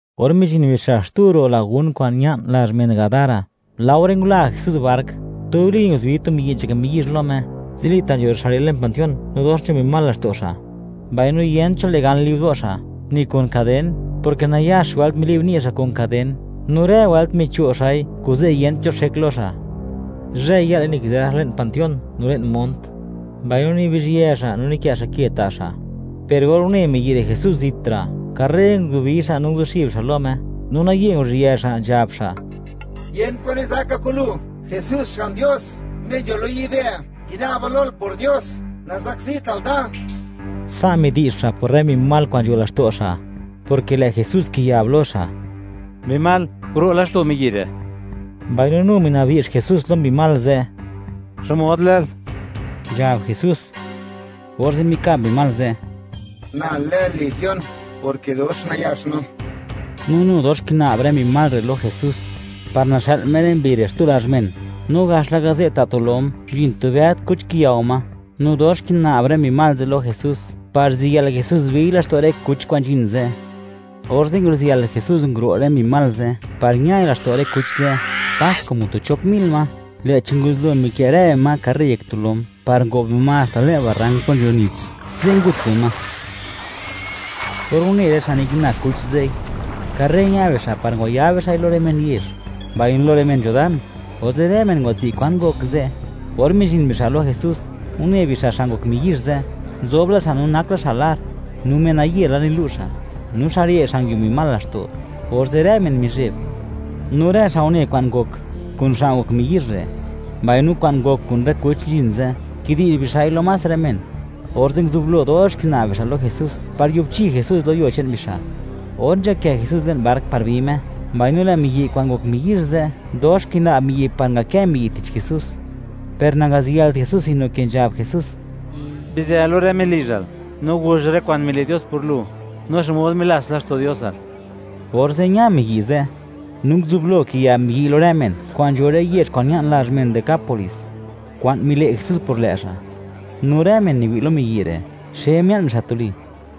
Or mizhin bixa' xtu ro' lagún kwa'n ña'n lazh men Gadara, laore ngula Jesús bark, tuli nguzubi tu miyi' nzhak miyizh lo Me, zilita' nzho xa' re' le'n panteón no dox nzho mbi mal laxto' xa'. Mbaino yent cho le' gan li'bdo' xa', ni kun kaden, porke nayax wëlt mili'b ni' xa' kun kaden; no rë wëlt micho' xa'i, kuze' yent cho xek lo xa'. Zhëy-yë'le nikizë xa' le'n panteón no le'n mont, mbaino nibizhyë xa', no nikë' xa' ke ta' xa'. Per or une miyi' re' Jesús zitra', karre nguzubi xa' no nguzuxib xa' lo Me, no naye nguru'zhië xa', nzhab xa': ―¡Yent kwan nizaka kun lu, Jesús Xga'n Dios, Me nzho lo yibë'! ¡Kina'ba lol por Dios, nazakzital da! Sa' midi'zh xa' por rë mbi mal kwa'n nzho laxto' xa', porke lë' Jesús kiyab lo xa': ―¡Mbi mal, guro' laxto' miyi' re'! Mbaino nu mina'bdi'zh Jesús lo mbi mal ze': ―¿Xmod lël? ―nzhab Jesús. Orze' mikab mbi mal ze': ―Na lë legión, porke dox nayax no. No nu dox kina'b rë mbi mal re' lo Jesús, par naxë'l Me rë mbi re' xtu lazh men. No gax laka ze', ta' tu lom; nzhin tu bëd kuch, kiyao ma, no dox kina'b rë mbi mal ze' lo Jesús par ziyël Jesús biy laxto' rë kuch kwa'n nzhin ze'. Orze' nguziyël Jesús, nguro' rë mbi mal ze' par ñai laxto' rë kuch ze', pas como tu chop mil ma; lë'chi nguzublo mikë' rë bima karre yek tu lom par ngob bima haxta le'n barrank plo nzho nits; ze' ngut bima. Or une rë xa' nikina kuch ze'i, karre ña bixa' par ngwayab bixa'i lo rë men yezh, mbaino lo rë men nzho dan. Orze', rë men ngwatswi' kwan ngok ze'. Or mizhin bixa' lo Jesús, une bixa' xa' ngok miyizh ze', nzob la xa' no nak la xa' lar, no menaye la nilu' xa'; no xa' re', xa' nguio mbi mal laxto'; orze' rë men mizheb. No rë xa' une kwa'n ngok kun xa' ngok miyizh re', mbaino kwa'n ngok kun rë kuch nzhin ze', kidi'zh bixa'i lo más rë men, orze' nguzublo dox kina'b bixa' lo Jesús, par yubchi Jesús lo yuo che'n bixa'. Or nzhakë Jesús le'n bark par bi Me, mbaino lë' miyi' kwa'n ngok miyizh ze', dox kina'b miyi' par ngakë miyi' tich Jesús, per nangaziyëlt Jesús, sino ke nzhab Jesús: ―Bizë lo rë men lizhal, no guzh rë kwa'n mile' Dios por lu, no xmod milats laxto' Diosal. Orze' ña miyi' ze', no nguzublo kiyab miyi'y lo rë men kwa'n nzho rë yezh kwa'n ña'n lazh men Decápolis, kwa'n mile' Jesús por lë' xa'. No rë men niwi' lo miyi' re', xe mia'n bixa' tuli.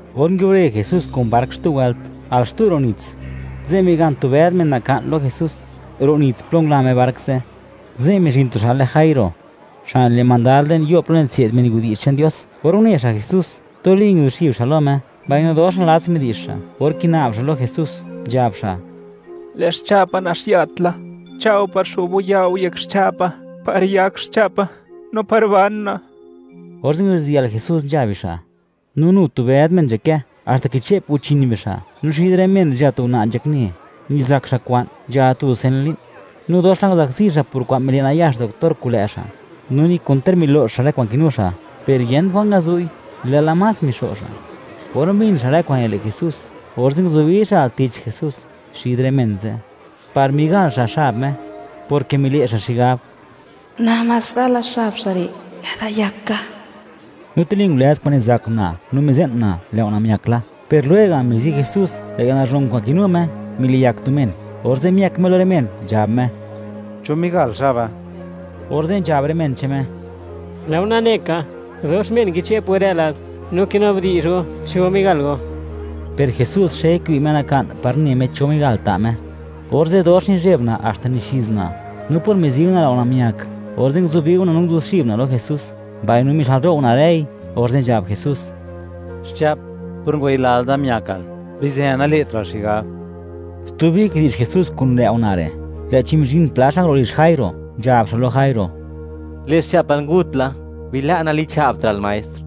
Or nguiubre Jesús kun bark xtu wëlt, al xtu ro' nits, ze' migan tu bëd men naka'n lo Jesús, ro' nits plo ngula Me bark ze'. Ze' mizhin tu xa' lë Jairo, xa' nile' mandad le'n yo' plo nitse'd men widi'zh che'n Dios. Or une xa' Jesús, tuli nguzuxib xa' lo Me, mbaino dox nalats midi'zh xa' or kina'b xa' lo Jesús, nzhab xa': ―Lë' xcha'pa naxiat la; cha'o par xo'b go ya' go yek xcha'pa, par yak xcha'pa no par ban una'. Orze' nguziyël Jesús nzha bixa', no nu tu bëd men nzhakë, haxta kiche'p guchin bixa'. No xid rë men re', nzho tu una' nzhakne, nizak xa' kwa'n, nzhala tu dusen li'n. No dox la nguzakzi xa' por kwa'n mile' nayax doctor kun lë' xa', no ni kon ter milo'x xa' rë kwa'n kinu xa'; per yent kwa'n ngazu'i, lë'la más mixo' xa'. Or mbin xa', rë kwa'n nile' Jesús, orze' nguzubi xa' al tich Jesús, xid rë men ze', par migal xa' xab Me, porke mile' xa' xigab: “Namás gala xab xa' re', lë'da yak ka.” No tuli ngulëz kwa'n nizak una' no mize'n una' lë' una' miak la. Per lwega', mizi Jesús, lë' yalnazhon kwa'n kinu Me, miliyak tu men. Orze' miëk Me lo rë men, nzhab Me: —¿Cho migal xaba? Orze' nzhab rë men che'n Me: ―Lë' go nane ka, dox men kiche'p go rë lad, no kinabdi'zh go, ¿cho migal go? Per Jesús xe kiwi' Me naka'n, par ne Me, cho men migal ta' Me. Orze' dox nizheb una' haxta nizhiz una', no por mizi una' lë' una' miak, orze' nguzubi una' no nguzuxib una' lo Jesús, mbaino mixë'lro' una' rëi. Orze' nzhab Jesús: ―Xcha'p, por ngwayilal da, miakal. Bizë, nale'tra'l xigab. Stubi kidi'zh Jesús kun lë' una' re', lë'chi mizhin pla xa' nguro' lizh Jairo, nzhab xa' lo Jairo: ―Lë' xcha'pal ngut la; bila' nalicha'btra'l Maestr.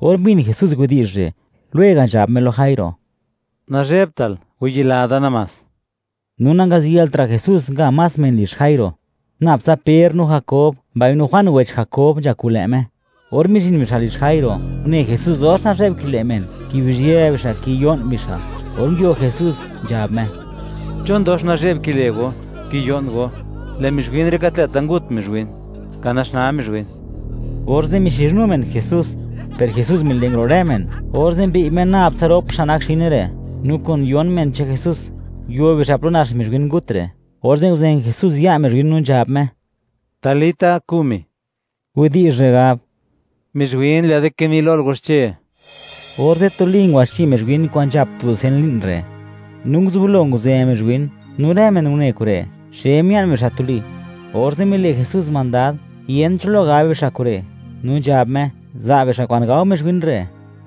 Or mbin Jesús widi'zh re', lwega' nzhab Me lo Jairo: ―Nazhebtal, wayila da namás. No nangaziyëltra' Jesús nga más men lizh Jairo; nab tsa Per, no Jakob, mbaino Juan wech Jakob nzha kun lë' Me. Or mizhin bixa' lizh Jairo, une Jesús dox nazhe'b kile' men, kibizhië bixa', kiyo'n bixa'. Or nguio Jesús, nzhab Me: ―¿Chon dox nazhe'b kile' go, kiyo'n go? Lë' mizhwin re', gat lë'ta' ngut mizhwin; ka naxnaa mizhwin. Orze' mixizhnu men Jesús, per Jesús mile' nguro' rë men, orze' mbi'y Me nab tsa rop xa' nak xine re', no kun yon men che'n Jesús, nguio bixa' plo nax mizhwin ngut re'. Orze' nguzen Jesús ya' mizhwin, no nzhab Me: ―¡Talita kumi! (Widi'zh rë gab: Mizhwin, lë'da kini lol: “¡Waxche!”) Orze' tuli ngwaxche mizhwin kwa'n nzhap tu dusen li'n re', no nguzublo nguzë mizhwin, no rë men une kure', xe mia'n bixa' tuli. Orze' mile' Jesús mandad, yent cho lo gab bixa' kure'; no nzhab Me, za' bixa' kwa'n gao mizhwin re'.